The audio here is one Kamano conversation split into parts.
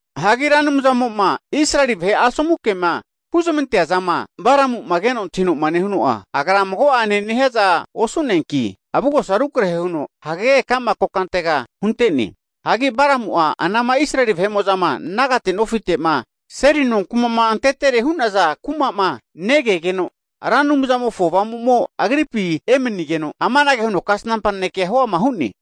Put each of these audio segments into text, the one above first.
Hagi Ra Anumzamo'ma Israeli vahe asomu kema huzamantea zama Balamu'ma keno antahino'ma nehuno'a, Agra mago'anena nehiaza osu'neanki, avugosa rukrahe huno hagege ka'ma kokantega hunte'ne. Hagi Balamu'a anama Israeli vahe'mo'zama nagate nofite'ma seli nonkuma'ma antetere hu'naza kuma'ma negegeno, Ra Anumzamofo Avamumo agripi emanigeno, amanage huno kasnampa nanekea huama hu'ne,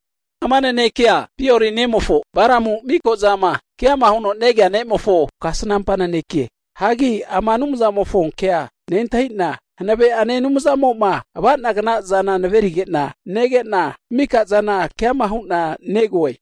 ama nanekea Beori nemofo Balamu miko'zama keama huno negea ne'mofo kasnampa naneke. Hagi ama Anumzamofo kea nentahina, hanave'ane Anumzamo'ma ava'nagna zana naverige'na nege'na, mikazana keama hu'na negoe.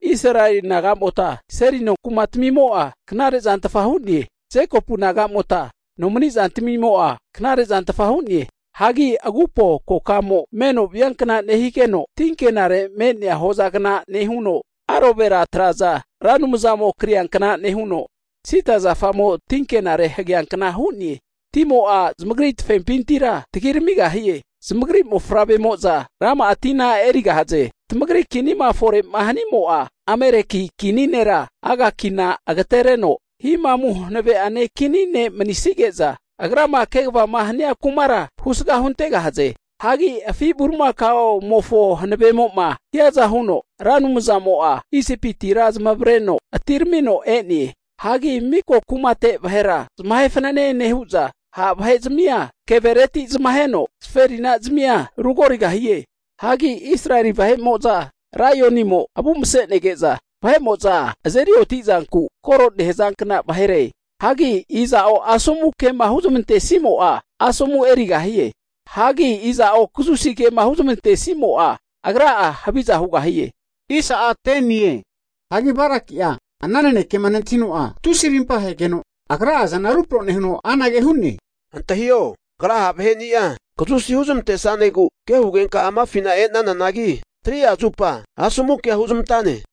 Israeli naga'mota seli no kumatamimo'a knare'zantfa hu'ne. Jekopu nagamota nomani zantamimo'a knare zantfa hu'ne. Hagi agupo kokamo me'no viankna nehigeno, tinkenare me'nea hozagna nehuno, Alovera traza Ra Anumzamo kriankna nehu'no, sida zafamo tinkenare hageanka hu'ne. Timo'a zamagri tafempintira tagiramigahie. Zamagri mofavremo'za rama'a tina erigahaze. Tamagri kinima fore'ma hanimo'a Ameleki kini nera Agakina agatereno himamu hanave'ane kini ne manisige'za agrama kegavama hania kumara husga huntegahaze. Hagi afi bulimakaomofo hanavemo'ma hiaza huno Ra Anumzamo'a Isipitira zamavareno atiramino e'ne. Hagi miko kumate vahera zamahe fananene nehu'za, ha' vahe'zamia kevereti zamaheno zaferinazamia rugorigahie. Hagi Israeli vahe'mo'za laionimo avu mase'nege'za vahe'mo'za azeri oti'zanku kore nehazankna vahere. Hagi iza'o asomu ke'ma huzamantesimo'a, asomu erigahie. Hagi iza'o kazusi kema huzamantesimo'a, agra'a haviza hugahie. Hagi Balaki'a ana nanekema nentahino'a tusi rimpa ahegeno agra'a azana rupro nehuno anage hu'ne, antahio kagra ha' vaheni'a kazusi huzamantesanegu ke hugenka amafina e'nananagi, 3'a zupa asomu kea huzamantane.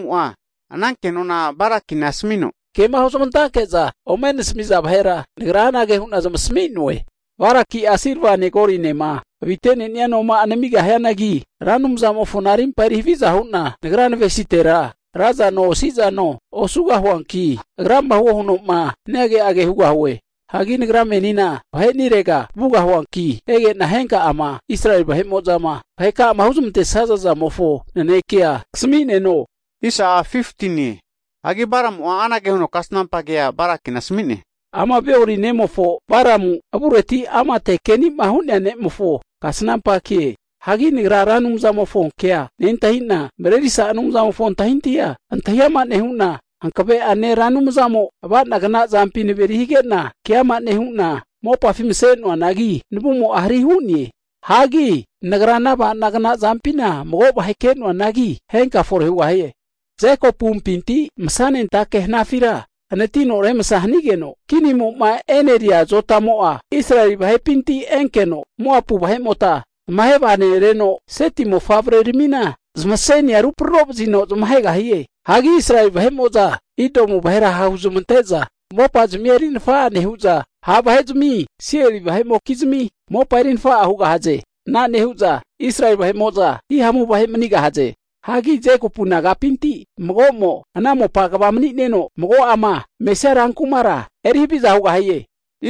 Higeno Balamu'a ana kenona Balakina asamino, kema huzamantanke'za ome nasami'naza vahera nagra anage hu'na zamasami'noe. Balaki'a silvane golinema avite'nenia noma'a namigahianagi, Ra Anumzamofona rimpa eri haviza hu'na nagra navesitera ra zano osi'zano osugahuanki, Agrama huo huno'ma hania ke'age hugahue. Hagi nagra menina vahe'nirega vugahuanki, ege'na henka'ama Israeli vahe'mo'zama vahekama huzamantesaza zamofo nanekea kasami'neno. Hagi Balamu'a anage huno kasnampa kea Balakina asami'ne, ama Beori nemofo Balamu avureti amate keni'ma hu'nea ne'mofo kasnampa ke. Hagi nagra Ra Anumzamofo kea nentahina, Mrerisa Anumzamofo antahintahi'a antahi ama nehu'na, Hankave'ane Ra Anumzamo ava'nagna zampi naveri hige'na, keama nehu'na mopafi mase'noanagi navumo'a hari hu'ne. Hagi nagra ana avanagna zampina mago vahe ke'noanagi, henka fore hugahie. Jekopumpinti masanentake hanafira hanatino remsa hanigeno, kinimo'ma e'neria azotamo'a Israeli vahepinti enkeno, Moapu vahe'mota tamahe vaganereno, Seti mofavreramina zmasenia ruprorovazino zamahegahie. Hagi Israeli vahe'mo'za Idomu vahera hahuzamante'za mopazmia erinafa'a nehu'za, ha' vahe'zami Seiri vahe'mokizmi mopa erinafa'a hugahaze. Ana nehu'za Israeli vahe'mo'za hihamu vahe manigahaze. Hagi Jekopu nagapinti mago'mo ana mopa kva mani'neno, mago'ama mesia rankumara erihaviza hugahie.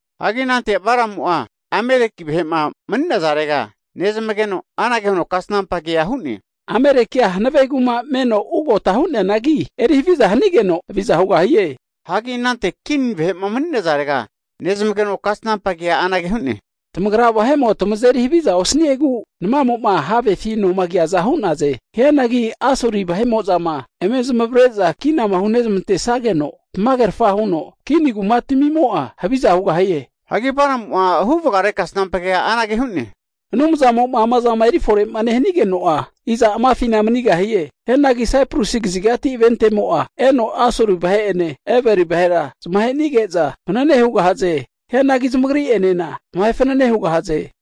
Hagi anante Balamu'a Ameleki vahe'ma mani'nazarega nezmageno, anage huno kasnampa kea hu'ne, Amelekia hanave kuma meno ugota hu'neanagi, eri haviza hanigeno haviza hugahie. Hagi anante Kin vahe'ma mani'nazarega nezmageno kasnampa kea anage hu'ne, tamagra vahemo tamazeri haviza osaniegu namamo'ma havefi noma kiaza hu'naze. Hianagi Asuri vahe'mo'zama eme zamavare'za kinama ome hunezamantesageno, tamagerafa huno Kin kumatamimo'a haviza hugahie. Hagi Balamu'a huvagare kasnampa kea anage hu'ne, Anumzamo'ma ama zama erifore'ma nehanigeno'a, iza amafina manigahie? Hianagi Saiprusi kazigati ventemo'a eno Asuri vahe'ene, Eberi vahera zamahe'nige'za fanene hugahaze. Hianagi zamagri'enena zamahe fanene hugahaze.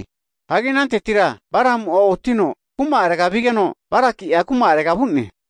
Hagi anantetira Balamu'a oti'no, kuma'arega vigeno, Balakia kuma'arega vu'ne.